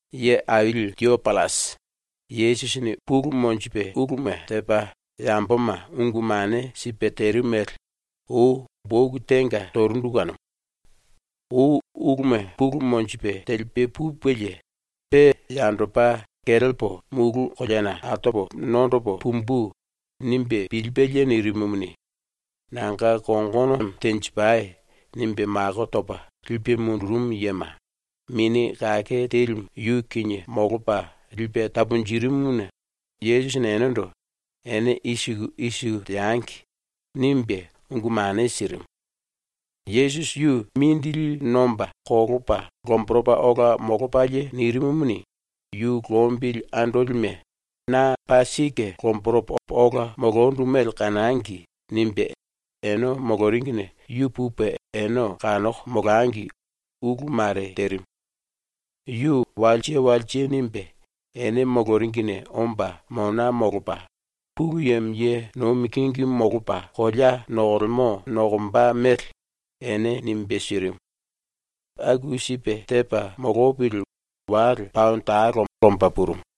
Ye Aili Tiopillasi, Yesusini pulu monjipe uluma tepa yamboma ungu mane sipe terimu mele ou boku tenga torundu kanumu. Ou uluma pulu monjipe telipe pupelie, pe yandopa ‘Kelepo mulu koleana altopo nondopo pumbu.’ nimbe pilipelie nirimumuni, “Nanga kongono tenjipai.” nimbe mako topa lipe mundurumu yema, Mini Kake Telimu yu kinie molopa lipe taponjirimuna Yesusini enendo “Ene i siku i siku teangi.” nimbe ungu mane sirimu. Yesusi yu mindili nomba kolopa lomboropa ola molopalie nirimumuni, yu ‘Lombili andolime na paa sike lomboropo ola molondu mele kanangi.’ nimbe ene moloringine yu pupe ene kanoko molangi ulu mare terimu. Yu walse walse nimbe ene moloringine omba mona molopa, Pulu Yemo ye nomi kingimu molopa kolea nokolemo nokomba mele ene nimbe sirimu. Aku sipe tepa molopili wale paono talo omba purumu.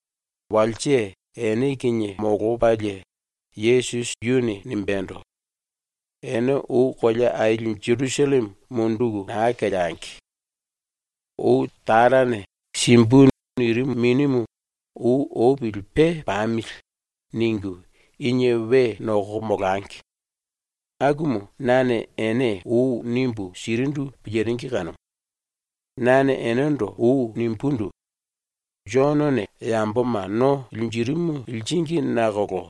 Walse ene kinie molopalie Yesusi yuni nimbendo: “Ene ou kolea aili Jerusalleme munduku naa keleangi. Ou Tarane “Simbu.” nirimu Minimu ‘Ou opili pe pamili.’ ningu inie we nokoko molangi. Akumu nane ene ou nimbu sirindu piliringi kanumu. Nane enendo ou nimbundu: “Jonone yamboma no linjirimu liringi nakolo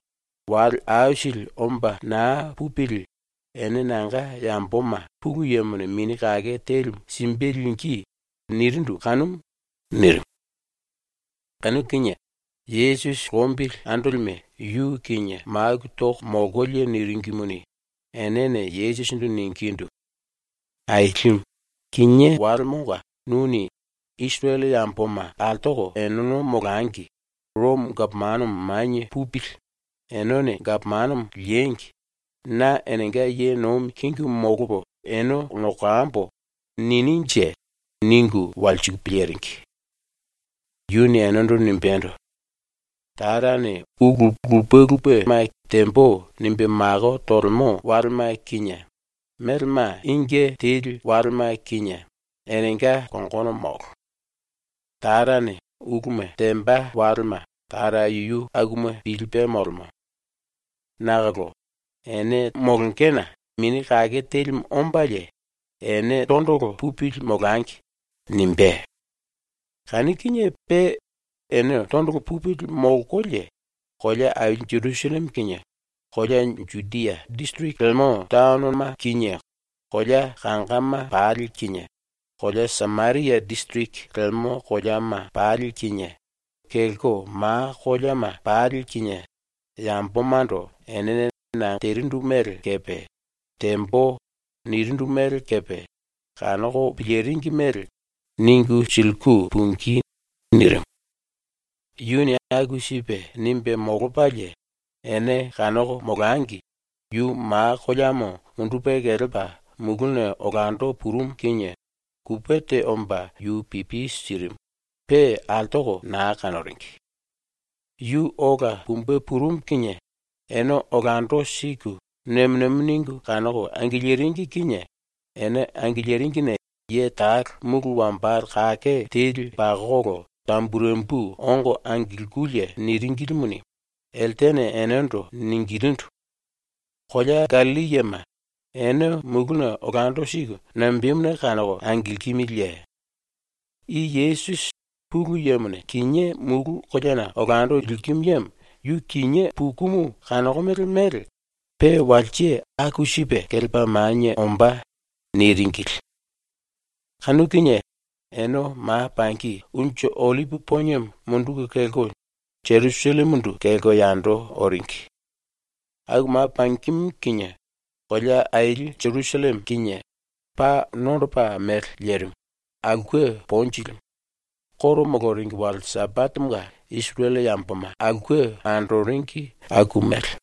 wale aisili omba naa pupili ene nanga yamboma Pulu Yemone Mini Kake Telimu simbe lingí.” nirindu kanumu.” nirimu. Kanu kinie Yesusi lombili andolime yu kinie maku toko molkolie niringimuni, enene Yesusindu ningindu: “Ailimu, kinié walemonga nuni “Isirele yamboma altoko eneno molangi, Romo gapomano manie pupili, eneno gapomano liengi, na enenga ye nomi kingimu molopo ene nokambo.” nininje?” ningu walsiku piliringi. Yuni enendo nimbendo: “Tarane ulu lupe lupe “Tembo.” nimbe mako tolemo walema kinie melema inge teli walema kinie enenga kongono molo. Tarane uluma temba walema Tara yuyu akuma pilipe molemo. Nakolo ene molongena Mini Kake Telimu ombalie ‘Ene tondolo pupili molangi.’ nimbé. Kanu kinie pe ene tondolo pupili molkolie kolea aili Jerusalleme kinie, kolea Judia disiriki lemo taonona kinie kolea kangama pali kinie, kolea Sameria disiriki lemo koleama pali kinie, kelko ma koleama pali kinie yambomando enene na terindu mele kepe “Tembo.” nirindu mele kepe kanoko piliringi mele ningu siliku pungí.” nirimu. Yuni aku sipe nimbe molopalie, ene kanoko molangi yu ma koleamo mundupe kelepa muluna olando purumu kinie kupe te omba yu pipi sirimu, pe altoko naa kanoringi. Yu ola pumbe purumu kinie ene olando siku nemo nemo ningu kanoko angiliringi kinie ene angiliringine ye talo mulu wambale kake pakokolo tamburembu ongo angilkululie niringilimuni, eltene enendo ningilindu: “Kolea Gallilli yema, ene muluna olando siku nambemuna kanoko angilkimiliye? I Yesusi, Pulu Yemone kinié mulu koleana olando likimu yemo, yu kinié pukumu kanokomele mele pe walse aku sipe kelepa manie ombá.” niringili. Kanu kinie ene ma pangi Unju Ollipi Poniemo munduku kelko Jerusallemendo kelko yando oringi. Aku ma pangimu kinie kolea aili ⸤Jerusalleme⸥ kinie paa nondopa mele lerimu, aulke ponjilimu, ⸤Juda yamboma koro moloringi⸥ wale Sambatemonga Isirele yamboma andoringi aku mele.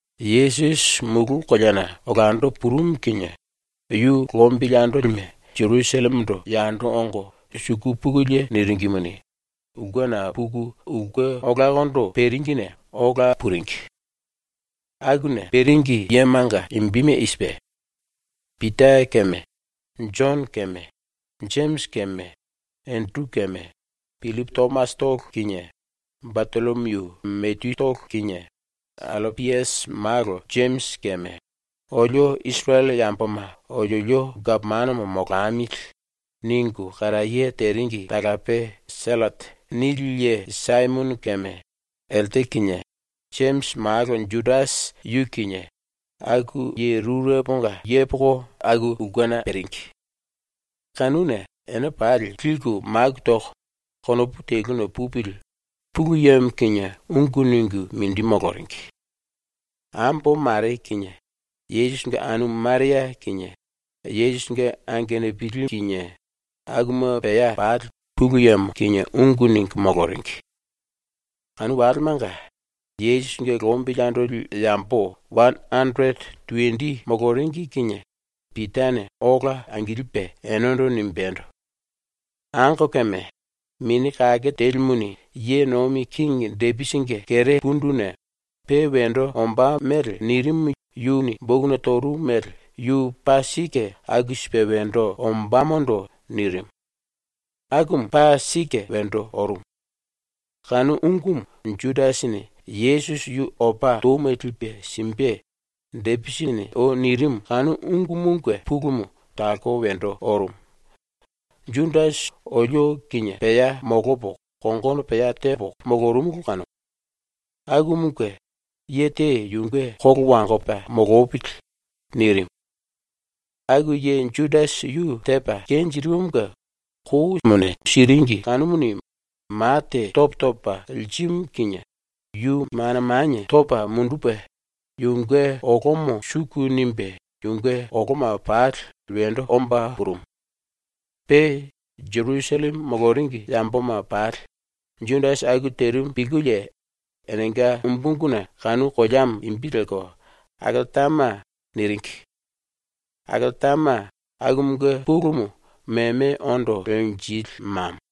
Yesusi mulu koleana olando purumu kinie yu lombili andolime Jerusallemendo yando ongo suku pukulie niringimuni, ulkena puku ulke olakondo peringine ola puringi. Akuna peringi yemanga imbime i sipe: Pita keme Jono keme Jemisi keme Enderu keme, Pillipu Tomasitolo kinie, Batollomiu Mateyutolo kinie, Allapiasi malo Jemisi keme “Olio Isirele yamboma oliolio gapomano molamili.” ningu karaye teringi talape ‘Sellote’ nili ye Saimono keme elte kinie, Jemisi malo Judasi yu kinie, aku ye rureponga yepoko aku ulkena peringi. Kanuna ene pali liku maku toko, konopu teluna pupili Pulu Yemo kinie ungu ningu mindi moloringi. Ambo mare kinie Yesusinge anumu Maria kinie Yesusinge angenupili kinie akuma pea pali Pulu Yemo kinie ungu ningu moloringi. Kanu walemanga Yesusinge lombili andoli yambo wane anderete tuwendi moloringi kinie Pitane ola angilipe enendo nimbendo: “Angokeme, Mini Kake Telimuni ⸤ye nomi kingi⸥ Depisinge kere punduna pe wendo ombá mele nirimu yuni bokuna torumu mele yu paa sike aku sipe wendo ombámondo nirimu. Akumu paa sike wendo orumu. Kanu ungumu Judasini Yesusi yu opa touma lipe simbe Depisini ou nirimu kanu ungumunge pulumu talko wendo orumu. Judasi olio kinie pea molopo kongono pea tepo molorumulu kanumu. Akumunge ye te yunge kolo wangopa molopili” nirimu. (Aku ye Judasi yu tepa kenjirimumunge kou siringi kanumuni ma te topo topa lirimu kinie yu mana manie topa mundupe yunge olomo suku nimbe yunge oloma pali wendo omba purumu. Pe Jerusalleme moloringi yamboma pali Judasi aku terimu pilkulie enenga umbu unguna kanu koleamo imbi lelko ‘Akeltama’ niringi. ‘Akeltama’ akumunge pulumu ‘Meme Ondo Lenjili Mamo’.)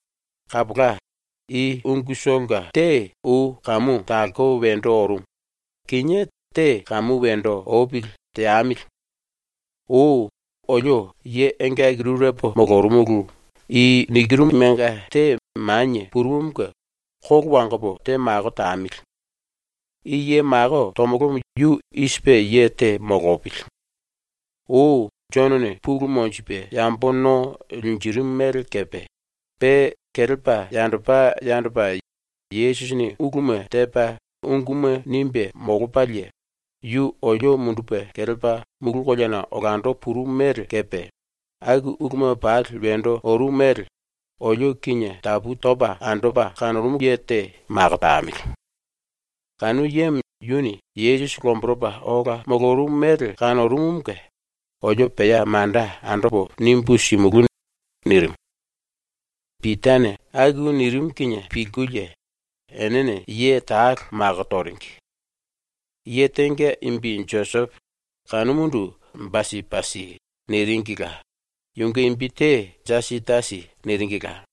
“Kapola, i ungutolonga te ou kamu talko wendo orumu, kinié te kamu wendo opili teamili. Ou olio ye engaki rurepo molorumulu i nikirumunge te manie purumumunge kolo wangopo te mako tamili. I ye mako tomolomo yu i sipe ye te molopili: Ou Jonone pulu monjipe yambo no linjirimu mele kepe, pe kelepa yandopa yandopa Yesusini uluma tepa unguma nimbe molopalie, yu olio mundupe kelepa mulu koleana olando purumu mele kepe, aku uluma pali wendo orumu mele, olio kinie tapu topa andopa kanorumu ye te mako tamili. Kanu yemo yuni Yesusi lomboropa ola molorumu mele kanorumumunge olio pea manda andopo nimbu simulú.” nirimu. Pitane aku nirimu kinie pilkulie enene ye talo mako toringi. Ye tenga imbi Josepo, kanumundu ‘Basipasi’ niringila, (yunge imbi te ‘Jasitasi’ niringila;)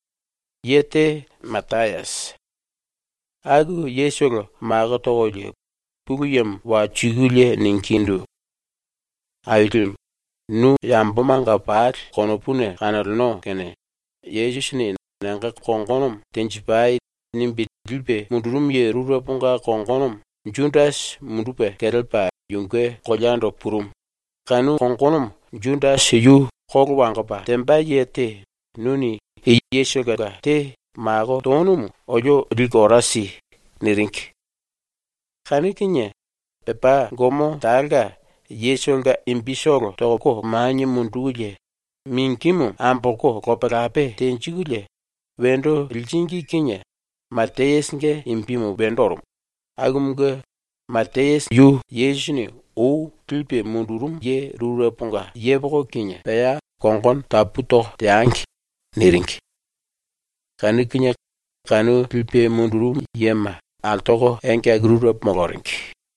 ye te Matayasi. Aku yetolo mako tokolie Pulu Yemo walsikulie ningindu: “Ailimu, nu yambomanga pali konopuna kanoleno kene Yesusini “Nanga kongono tenjipai.” nimbe lipe mundurumu ye rureponga kongonomo Judasi mundupe kelepa yunge koleando purumu, kanu kongonomo Judasi yu kolo wangopa temba ye te nuni i yetolonga te mako tonumu olio liku ora si.” niringi. Kanu kinie pepá gomo talonga yetolonga imbitolo toko manie mundukulie mingimu ambolko lope lope tenjikulie wendo liringi kinie Matayasinge imbimu wendo orumu, kinie “Yesusini ou lipe mundurumu ye rureponga yepoko kinie pea kongono tapu toko teangi.” niringi. Kanu kinie kanu lipe mundurumu yema altoko engaki rurepo moloringi.